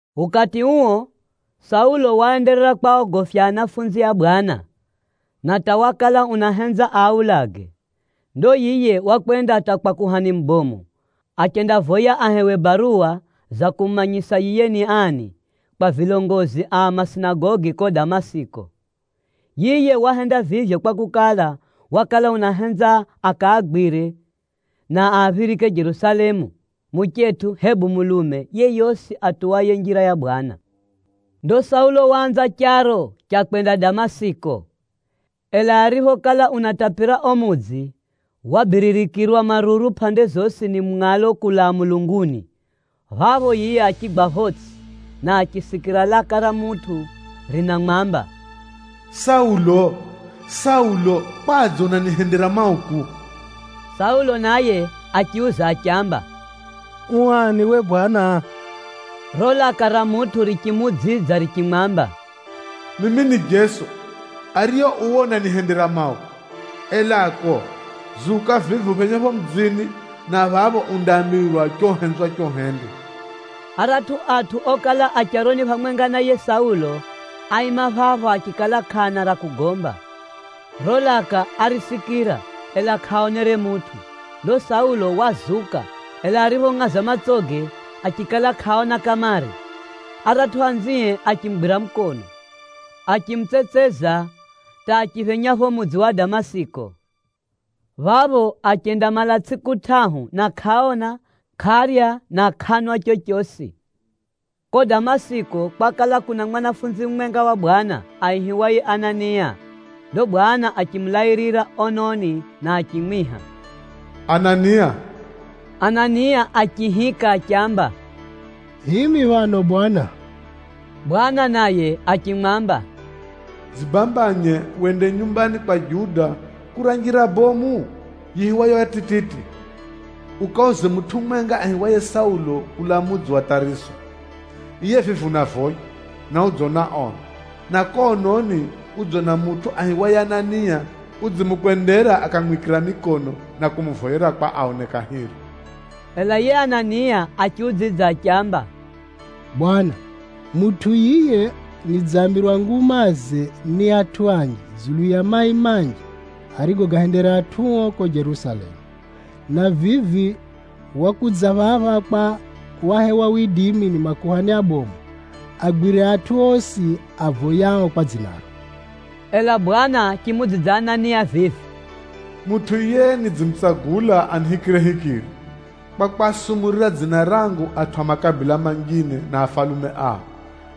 Ukati uo, Saulo waenderera kwaogofya anafunzi a Bwana, na hata wakala unahenza aaulage. Ndo yiye wakwenda hata kwa kuhani mubomu, achendavoya ahewe baruwa za kumumanyisa yiye ni ani, kwa vilongozi a masinagogi ko Damasiki. Yiye wahenda vivyo kwakukala, wakala unahenza akaagwire na aaphirike Jerusalemu, muchetʼu hebu mulume yeyosi atuwaye Njira ya Bwana. Ndo Saulo waanza charo cha kwenda Damasiki. Ela ariphokala unatapira o mudzi, wabiririkirwa maruru pʼande zosi ni mungʼalo kulaa mulunguni. Phapho yiye achigwa photsʼi, na achisikira laka ra mutʼu rinamwamba, “Saulo, Saulo! Kwadze unanihendera mauku?” Saulo naye achiuza achiamba, “U ani we bwana?” Riro laka ra mutʼu richimuudzidza richimwamba, “Mimi ni Jeso, ariye uwe unanihendera mauku. Elako, zuka vivi uphenye pho mudzini, na phapho undaambirwa cho uhenzwacho uhende.” Aratʼu atʼu okala a charoni phamwenga na yiye Saulo, áima phapho achikala kʼaana ra kugomba. Riro laka árisikira, ela kʼaaonere mutʼu. Ndo Saulo wazuka, ela ariphongʼaza matsoge, achikala kʼaona kamare. Aratʼu anzie achimugwira mukono, achimutsetseza hata achiphenya pho mudzi wa Damasiki. Phapho achendamala tsʼiku tʼahu na kʼaona, kʼarya na kʼanwa chochosi. Kuko Damasiki, kwakala kuna mwanafunzi mumwenga wa Bwana, aihiwaye Anania. Ndo Bwana achimulairira ononi na achimwiha, “Anania!” Anania achiihika achiamba, “Himi phano Bwana!” Bwana naye achimwamba, “Dzibambanye wende nyumbani kwa Juda kura njira bomu yiihiwayo ya tititi, ukauze mutʼu mumwenga aihiwaye Saulo kulaa mudzi wa Tʼariso. Yiye vivi unavoya, na udzona ono. Na ko ononi udzona mutʼu aihiwaye Anania, udzimukwendera akamwikira mikono na kumuvoyera kwa aone kahiri.” Ela yiye Anania achiudzidza achiamba, “Bwana, mutʼu yiye nidzambirwa ngumaze ni atʼu anji dzulu ya mai manji arigoahendera atʼuo ko Jerusalemu, na vivi wakudza phapha kwa wahewa widimi ni makuhani abomu, agwire atʼu osi avoyao kwa dzinaro.” Ela Bwana achimuudzidza Anania vivi, “Mutʼu yiye nidzimutsagula anihikirehikire, kwa kwasumurira dzina rangu atʼu a makabila manjine na afalume ao,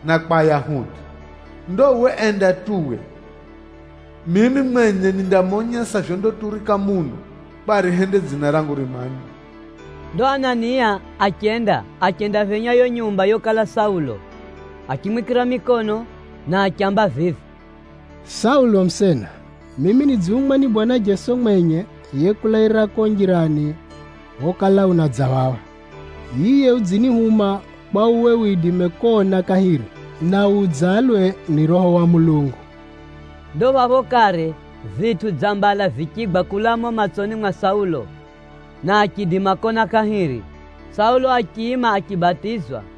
na kwa Ayahudi. Ndo uwe enda tu we! Mimi mwenye nindamonyesa vyondaturika muno, kwa arihende dzina rangu rimanywe.” Ndo Anania achenda, achendaphenya yo nyumba yokala Saulo. Achimwikira mikono, na achiamba vivi, “Saulo musena, mimi nidzihumwa ni Bwana Jeso mwenye yekulairira ko njirani phokala unadza phapha. Yiye udzinihuma kwa uwe widime kona kahiri, na wudzalwe ni Roho wa Mulungu.” Ndo phapho kare, vitʼu dza mbala vichigwa kulaa mumo matsoni mwa Saulo, na achiidima kona kahiri. Saulo achiima achibatizwa,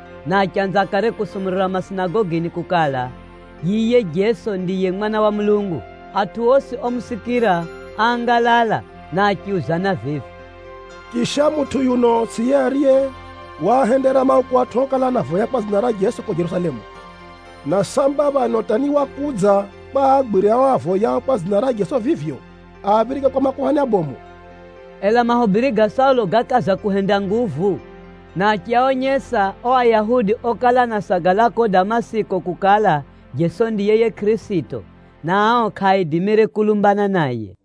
na achanza kare kusumurira masinagogini kukala, yiye Jeso ndiye Mwana wa Mulungu. Atʼu osi omusikira áangalala na achiuzana vivi, “Chisha, mutʼu yuno tsʼiye ariye waahendera mauku atʼu okala anavoya kwa dzina ra Jeso ko Jerusalemu? Na samba phano hata ni wakudza kwa aagwire ao avoyao kwa dzina ra Jeso vivyo, aaphirike kwa makuhani abomu?” Ela mahubiri ga Saulo gákaza kuhenda nguvu, na achiaonyesa o Ayahudi okala anasagala ko Damasiki kukala, Jeso ndiye yiye Kʼirisito, na ao kʼaaidimire kulumbana naye.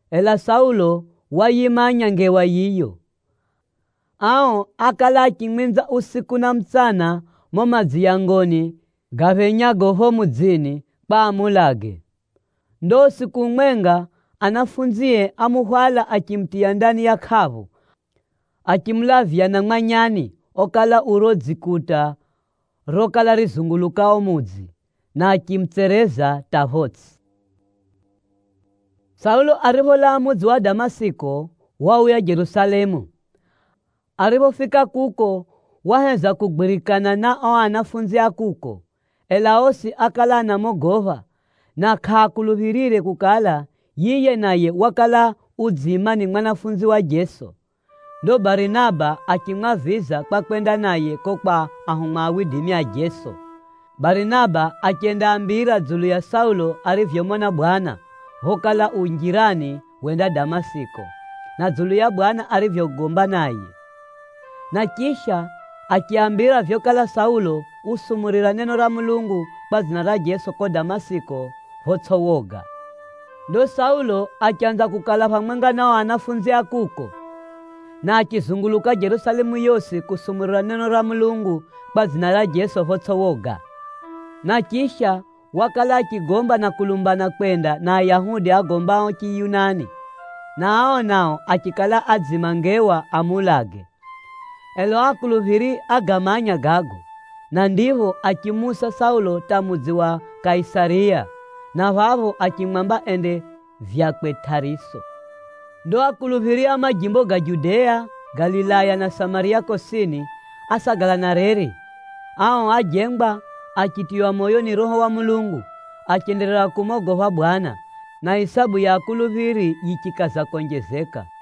Ela Saulo wayimanya ngewa yiyo. Ao ákala achimwinza usiku na mutsana mumo madziyangoni gaphenyago pho mudzini kwa amuulage. Ndo usiku umwenga, anafunzie ámuhwala achimutiya ndani ya hundu bomu, achimulavya na mwanyani okala u dzikuta ra o mudzi, na achimutsereza hata photsʼi. Saulo wauya Jerusalemu na ariphofika kuko waheza kugwirikana na o anafunzi a kuko, ela osi ákala anamogopha, na kʼaakuluphirire kukala yiye naye ni mwanafunzi wa Jeso jeri. Ndo Barinaba achimwaviza kwa kwenda naye ko kwa ahumwa a Jeso. Barinaba achendaambira dzulu ya Saulo arivyomona Bwana, phokala u njirani wenda Damasiki, na dzulu ya Bwana arivyogomba naye. Na chisha, achiaambira vyokala Saulo usumurira neno ra Mulungu kwa dzina ra Jeso ko Damasiki photsʼi woga. Ndo Saulo achanza kukala phamwenga na o anafunzi a kuko, na achizunguluka Jerusalemu yosi kusumurira neno ra Mulungu kwa dzina ra Jeso photsʼi woga. Na chisha, wakala achigomba na kulumbana kwenda na Ayahudi agombao Chiyunani, na ao nao achikala adziima ngewa amuulage. Ela o akuluphiri ágamanya gago, na ndipho achimuusa Saulo hata mudzi wa Kaisariya, na phapho achimwamba ende vyakwe Tʼariso. Ndo akuluphiri a majimbo ga Judea, Galilaya na Samariya kosini, ásagala na reri. Ao ájengwa, achitiywa moyo ni Roho wa Mulungu, achenderera kumogopha Bwana, na isabu ya akuluphiri yichikaza konjezeka.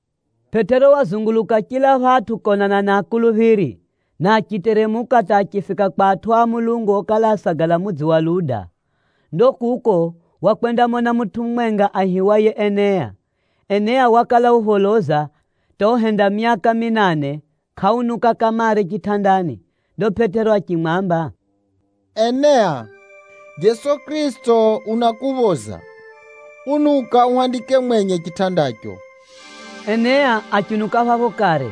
Pʼetero wazunguluka chila phatʼu konana na akuluphiri, na achiteremuka hata achifika kwa atʼu a Mulungu okala anasagala mudzi wa Luda. Ndo kuko, wakwendamona mutʼu mumwenga aihiwaye Enea. Enea wakala upholoza hata uhenda myaka minane kʼaunuka kamare chitʼandani. Ndo Pʼetero achimwamba, “Enea, Jeso Kʼirisito unakuphoza. Unuka uhandike mwenye chitʼandacho.” Enea achiunuka phapho kare.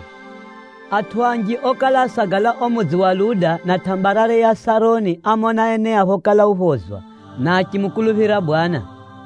Atʼu anji okala anasagala o mudzi wa Luda na tʼambarare ya Sharoni ámona Enea phokala uphozwa, na achimukuluphira Bwana.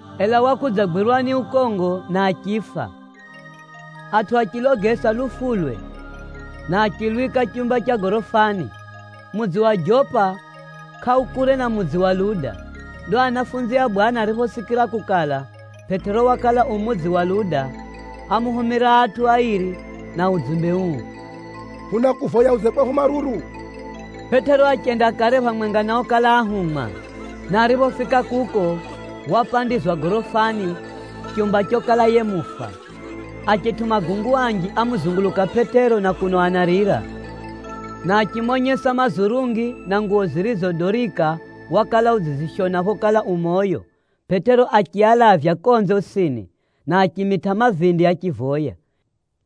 Ela wakudzagwirwa ni ukongo na achifa. Atʼu achilogesa lufulwe, na achilwika chumba cha gorofani. Mudzi wa Jopa kʼaukure na mudzi wa Luda. Ndo anafunzi a Bwana ariphosikira kukala, Pʼetero wakala u mudzi wa Luda, ámuhumira atʼu airi na udzumbe uu, “Hunakuvoya udze kwehu maruru.” Pʼetero achenda kare phamwenga na okala ahumwa, na ariphofika kuko, wapandizwa gorofani, chumba chokala yiye mufa. Achetʼu magungu anji ámuzunguluka Pʼetero na kuno anarira, na achimonyesa mazurungi na nguwo zirizo Dorika wakala udzizishona phokala u moyo. Pʼetero achialavya konze osini, na achimitʼa mavindi achivoya.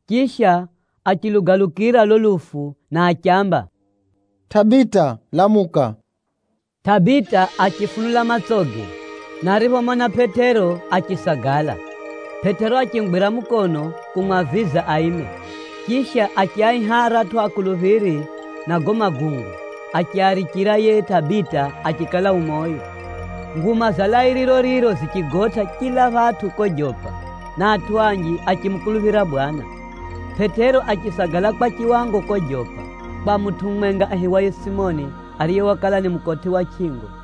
Chisha, achilugalukira lo lufu na achiamba, “Tʼabita, lamuka!” Tʼabita achifunula matsoge, na ariphomona Pʼetero, achisagala. Pʼetero achimugwira mukono kumwaviza aime. Chisha, achiaiha aratʼu akuluphiri na gago magungu, achiarichira yiye Tʼabita achikala u moyo. Nguma za lairiro riro zichigotʼa chila phatʼu ko Jopa, na atʼu anji achimukuluphira Bwana. Pʼetero achisagala kwa chiwango ko Jopa, kwa mutʼu mumwenga aihiwaye Simoni, ariye wakala ni mukotʼi wa chʼingo.